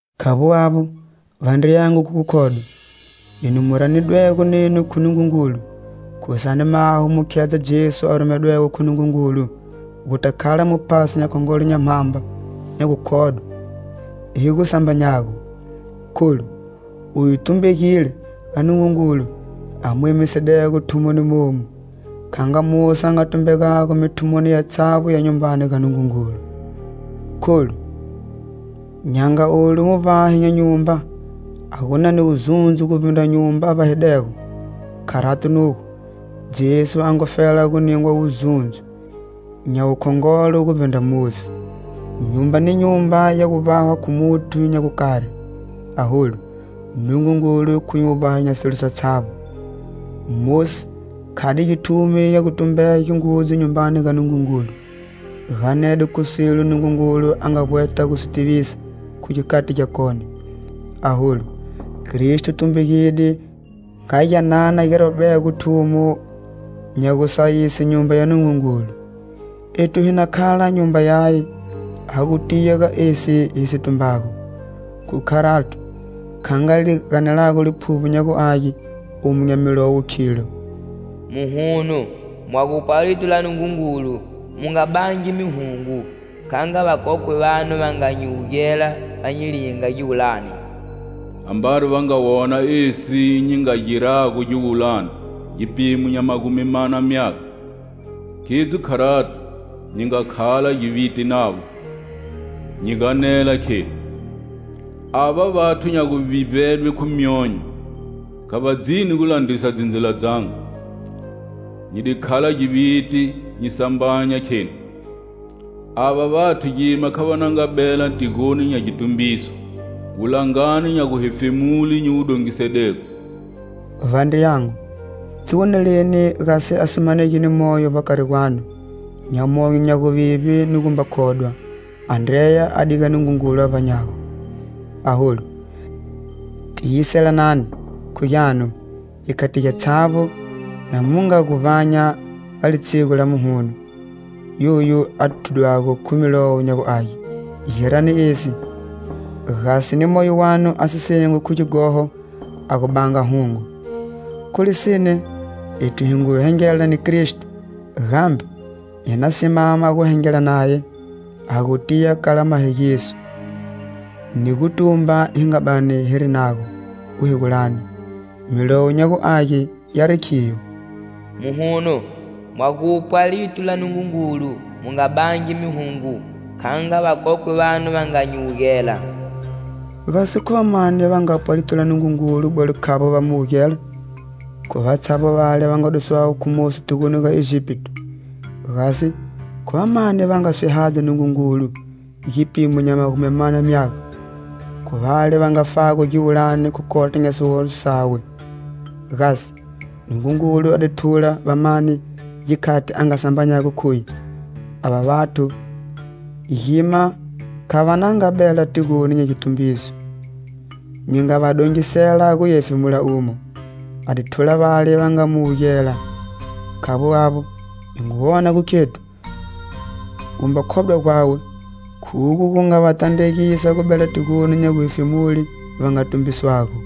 Khavbo avbo, vandriyangu khu gukhodwa, enu mu ranidwego nenu khu Nungungulu, khusani maho mu khedza Jesu a rumedwego khu Nungungulu, guta khala Muphasi nya Khongolo nya mhamba nya gukhodwe hi gu sambanyago. Kholu uye tumbegile ga Nungungulu a mu emisidego thumoni momu, kha nga Mosi a nga tumbegago mithumoni yatshavbo ya Nyumbani ga Nungungulu. Kholu, nya nga olu muvbahi nya nyumba a gu na ni wuzundzo guvbindra nyumba a vbahidego, kharato nugo, Jesu a ngufela gu ningwa wuzundzo nya wukhongolo guvbindra Mosi. Nyumba ni nyumba ya gu vbahwa khu muthu nya gukari, aholu, Nungungulu khuye Muvbahi nya silo satshavbo. Mosi khade githumi nya gutumbege ngudzu Nyumbani ga Nungungulu, ganede khu silo Nungungulu a nga vbweta gu si tivisa khu gikhati gyakone. Aholu, Kristo tumbegide nga gyanana gi rwadego thumo nya gusayise Nyumba ya Nungungulu. Ethu hi na khala nyumba yaye ha gu tiya ga esi hi si tumbago. Khu kharato, kha nga li ganelago Liphuvbo nya gu Age omu nya Milowo, khilo: "Muhuno, mwa gupwa lito la Nungungulu, mu nga bangi mihungo kha nga vakokwe vanu va nga nyi wugela, va nyi linga giwulani. Ambari va nga wona esi nyi nga girago giwulani gipimo nya magumi mana myaga. Khidzo kharato nyi nga khala giviti navo,nyi ganela kheni:'Ava vathu nya guvivbedwe khu myonyo,kha va dzini gu landrisa dzindzila dzangu.' Nyi di khala giviti nyi sambanya kheni:'Ava vathu gima kha va na nga bela tigoni nya gitumbiso, wulangani nya guhefemule nyi wu dongisedego.' " Vandriyangu, dziwoneleni gasi a si manegi ni moyo vbakari gwanu, nya monyo nya guvivbe ni gumba khodwa a ndreya a diga Nungungulu a vbanyago. Aholu, tiyiselanani, khu gyanu, gikhati gyatshavbo, na mu nga guvbanya ga litshigu la "Muhuno" yoyu a thudwago khu Milowo nya gu Age. Girani esi, gasi ni moyo wanu a si sengwi khu gighoho a gu banga hungo. Khu lisine, ethu hi ngu hengela ni Kristo, gambe hi na simama gu hengela naye, ha gu tiya kala mahegiso ni gutumba hi nga bani hiri nago guhegulani. Milowo nya gu Age yari khiyo: "Muhuno, mwa gupwa lito la Nungungulu,mu nga bangi mihungo,kha nga vakokwe vanu va nga nyi wugela." Gasi khu va mani va ngapwa lito la Nungungulu bwelo khavbo va mu wugela? Khu vatshavbo vale va nga duswago khu Mosi tigoni ga Egipito. Gasi khu va mani va nga swihadza Nungungulu gipimo nya magumi mana myaga? Khu vale va ngafago giwulani khu kota nya sighoho sawe. Gasi Nungungulu a di thula va mani gikhati a nga sambanyago khuye: "Ava vathu gima kha va na nga bela tigoni nya gitumbiso, nyi nga va dongisela guya hefemula umo?" A di thula vale va nga mu wugela. Khavbo avbo, hi ngu wona gu khethu, gumba khodwa gwawe khugo gu nga va tandregisa gu bela tigoni nya guhefemule va nga tumbiswago.